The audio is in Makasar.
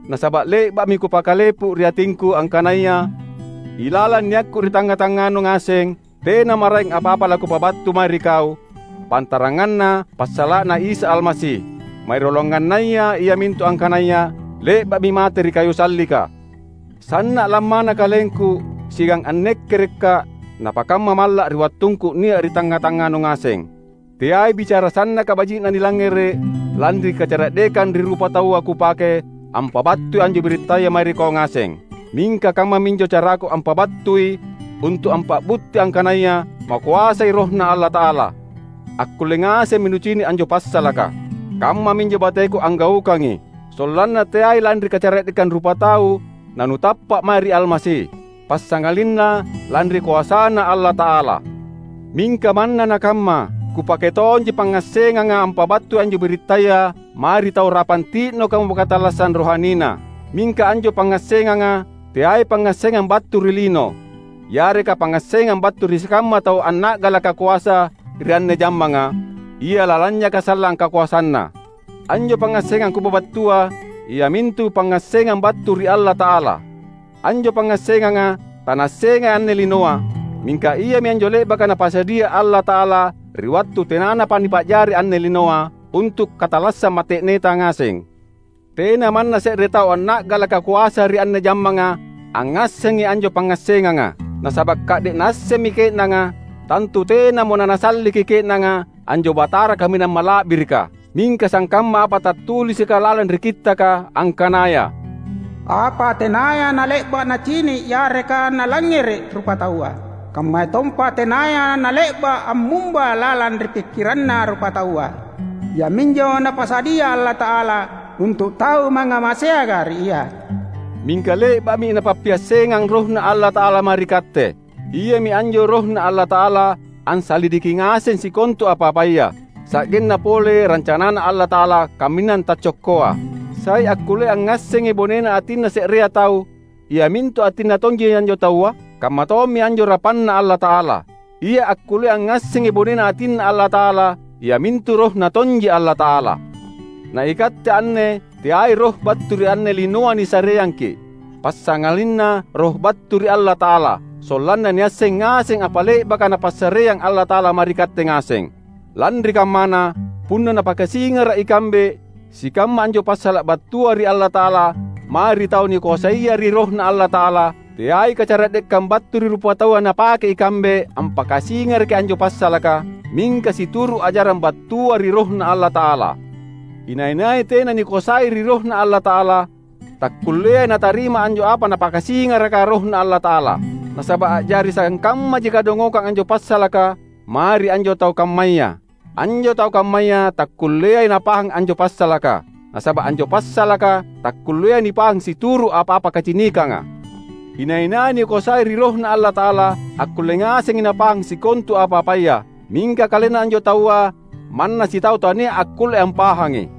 Nasaba’ le’ba’mi kupakkalepu ri atingku angkanaya ilalang niakku ri tangnga-tangnganu ngaseng, tena maraeng apa-apa lakupabattu mae ri kau, pantaranganna passala’na Isa Almasi; marioloangannaya iamintu angkanaya le’ba’mi mate ri kayu sallika. Sanna’ lammana kalengku siagang annekkerekka’ napakamma malla’ ri wattungku nia’ ri tangnga-tangnganu ngaseng. Teai bicara sannaka baji’na nilangngere’ lanri kacara’dekang ri rupataua kupake ampabattui anjo birittaya mae ri kau ngaseng. Mingka kammaminjo caraku ampabattui untu’ ampa’butti angkanaya makoasai RohNa Allata’ala. Akkulle ngasemmi nucini’ anjo passalaka. Kammaminjo bateku anggaukangi, sollanna teai lanri kacara’dekang rupatau nanutappa’ mae ri Almasi, passangalinna lanri koasaNa Allata’ala. Mingka manna nakamma, kupake tonji pangngassenganga ampabattui anjo birittaya mae ri tau rapang ti’nokamo katallassang rohanina. Mingka anjo pangngassenganga teai pangngassengang battu ri lino, yareka pangngassengang battu ri sikamma tau anna’galaka koasa ri anne jammanga, ia lalanynyaka sallang kakoasanna. Anjo pangngassengang kupabattua iamintu pangngassengang battu ri Allata’ala. Anjo pangngassenganga tanaassengai anne linoa, mingka iami anjo le’baka Napasadia Allata’ala ri wattu tenanapa nipa’jari anne linoa, untu’ katallassang mate’neta ngaseng. Tena manna se’re tau anna’galaka koasa ri anne jammanga angngassengi anjo pangngassenganga. Nasaba’ ka’de’ naassemmi ke’nanga, tantu tenamo nanasalliki ke’nanga anjo Batara kaminang mala’birika. Mingka sangkamma apa tattulisika lalang ri Kittaka angkanaya, "Apa tenaya nale’ba’ nacini’ yareka nalangngere’ rupataua, kammayatompa tenaya nale’ba’ ammumba lalang ri pikkiranna rupataua, iaminjo Napasadia Allata’ala untu’ tau mangngamaseanga ri Ia." Mingka le’ba’mi Napappiassengang RohNa Allata’ala mae ri katte. Iami anjo RohNa Allata’ala ansalidiki ngasengi sikontu apa-apaya, sa’genna pole rancanaNa Allata’ala kaminang taccokkoa. Sai akkullea angngassengi bonena atinna se’rea tau, iamintu atinna tonji anjo taua? Kammatommi anjo rapanna Allata’ala. Ia akkullea angngassengi bonena atinNa Allata’ala iamintu RohNa tonji Allata’ala! Na ikatte anne teai roh battu ri anne linoa nisareangki’, passangalinna Roh battu ri Allata’ala; sollanna niasseng ngaseng apa le’baka Napassareang Allata’ala mae ri katte ngaseng. Lanri kammana, punna napakasingara’ ikambe sikamma anjo passala’ battua ri Allata’ala mae ri tau nikoasaia ri RohNa Allata’ala, teai kacara’dekang battu ri rupataua napake ikambe ampakasingaraki anjo passalaka, mingka situru’ ajarang battua ri RohNa Allata’ala. Inai-nai tena nikoasai ri RohNa Allata’ala, takkulleai natarima anjo apa Napakasingaraka RohNa Allata’ala. Nasaba’ a’jari sangkammaji kadongokang anjo passalaka mae ri anjo tau kammaya. Anjo tau kammaya takkulleai napahang anjo passalaka, nasaba’ anjo passalaka takkulleai nipahang situru’ apa-apa kacinikanga. Inai-nai nikoasai ri RohNa Allata’ala, akkulle ngasengi napahang sikontu apa-apaya; mingka kalenna anjo taua manna sitau tania’ akkulle ampahangi.